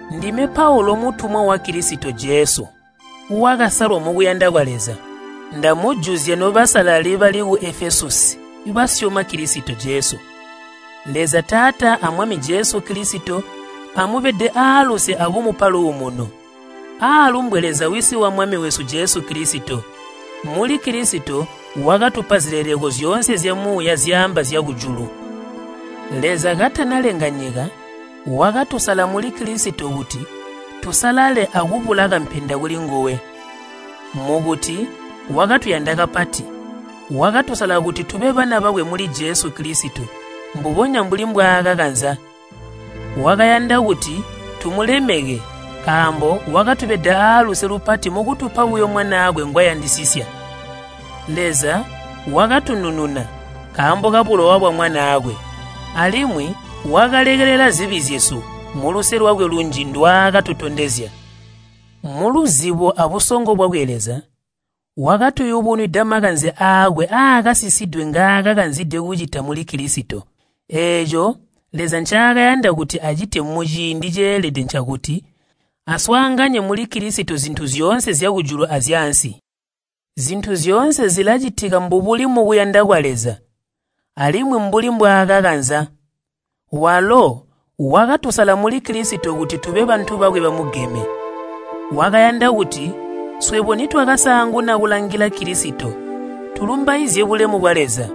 Ndime Paulu mutumwa wa Kilisito Jesu wakasalwa mukuyanda kwa Leza. Ndamujuzya nobasalali bali ku Efesusi basyoma Kilisito Jesu. Leza Taata a Mwami Jesu Kilisito amubede aaluse akumupa luumuno. Aalumbwe Leza Wisi wa Mwami wesu Jesu Kilisito. Muli Kilisito wakatupa zileleko zyoonse zyamuuya zyaamba zyakujulu. Leza katanalenga nyika, wakatusala muli Kilisito kuti tusalale akubula kampenda kulinguwe. Mukuti wakatuyanda kapati, wakatusala kuti tube bana bakwe muli Jesu Kilisito mbubonya mbuli mbwaakakanza. Wakayanda kuti tumulemeke nkaambo wakatubeda aaluse lupati mukutupa buyo Mwanaakwe ngwayandisisya. Leza wakatunununa nkaambo kabulowa bwa Mwanaakwe, alimwi wakalekelela zibi zyesu, muluse lwakwe lunji ndwaakatutondezya. Muluzibo abusongo bwakwe Leza wakatuyubunwida makanze aakwe aakasisidwe ngaakakanzide kucita muli Kilisito. Eeco Leza ncaakayanda kuti acite muciindi ceelede ncakuti aswaanganye muli Kilisito zintu zyoonse zyakujulu azyaansi. Zintu zyoonse zilacitika mbubuli mukuyanda kwa Leza alimwi mbuli mbwaakakanza. Walo wakatusala muli Kilisito kuti tube bantu bakwe bamugeme. Wakayanda kuti swebo nitwakasaanguna kulangila Kilisito, tulumbaizye bulemu bwa Leza.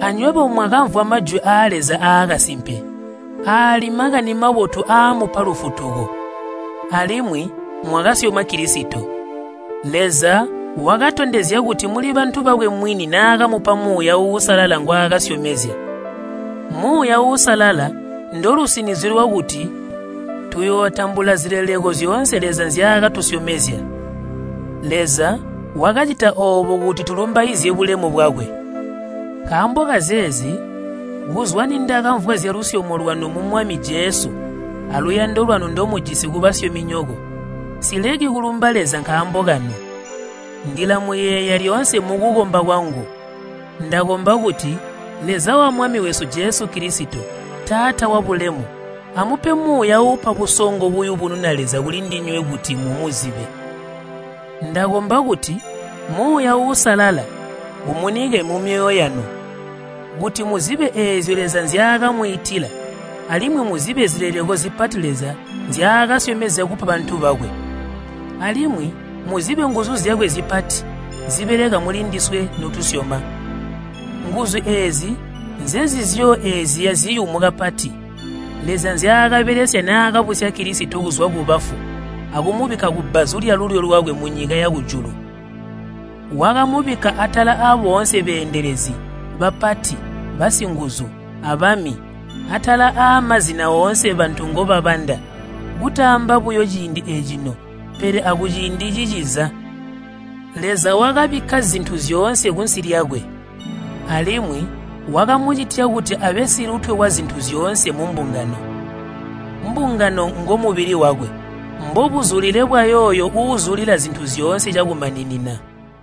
Anywebo mwakamvwa Majwi aa Leza aakasimpe, aali Makani Mabotu aamupa lufutuko, alimwi mwakasyoma Kilisito. Leza wakatondezya kuti muli bantu bakwe mwini naakamupa Muuya Uusalala ngwaakasyomezya. Muuya Uusalala ndolusinizyo lwakuti tuyootambula zileleko zyoonse Leza nzyaakatusyomezya. Leza wakacita oobo kuti tulumbaizye bulemu bwakwe. Nkaambo kazeezi ndakamvwa zyalusyomo lwanu mu Mwami Jesu aluyando lwanu ndomujisi kubasyominyoko, nsileki kulumba Leza nkaambo kanu. Ndilamuyeeya lyoonse mukukomba kwangu. Ndakomba kuti Leza wa Mwami wesu Jesu Kilisito, Taata wabulemu, amupe Muuya uupa busongo buyubununa Leza kulindinywe kuti mumuzibe. Ndakomba kuti Muuya Uusalala umunike mumyoyo yanu kuti muzibe eezyo Leza nzyaakamwiitila alimwi muzibe zileleko zipati Leza nzyaakasyomezya kupa bantu bakwe. Alimwi muzibe nguzu zyakwe zipati zibeleka mulindiswe notusyoma. Nguzu eezi nzenzizyo eziya ziyumu kapati, Leza nzyaakabelesya naakabusya Kilisito kuzwa kubafu akumubikka kubbazu lyalulyo lwakwe munyika yakujulu. Wakamubikka atala aboonse beendelezi, bapati, basinguzu, abami, aatala aamazina oonse bantu ngobabanda, kutaamba buyo ciindi ecino, pele akuciindi ciciza. Leza wakabikka zintu zyoonse kunsi lyakwe, alimwi wakamucitya kuti abe silutwe wazintu zyoonse mumbungano. Mbungano ngomubili wakwe, mbobuzulile bwayooyo uuzulila zintu zyoonse cakumaninina.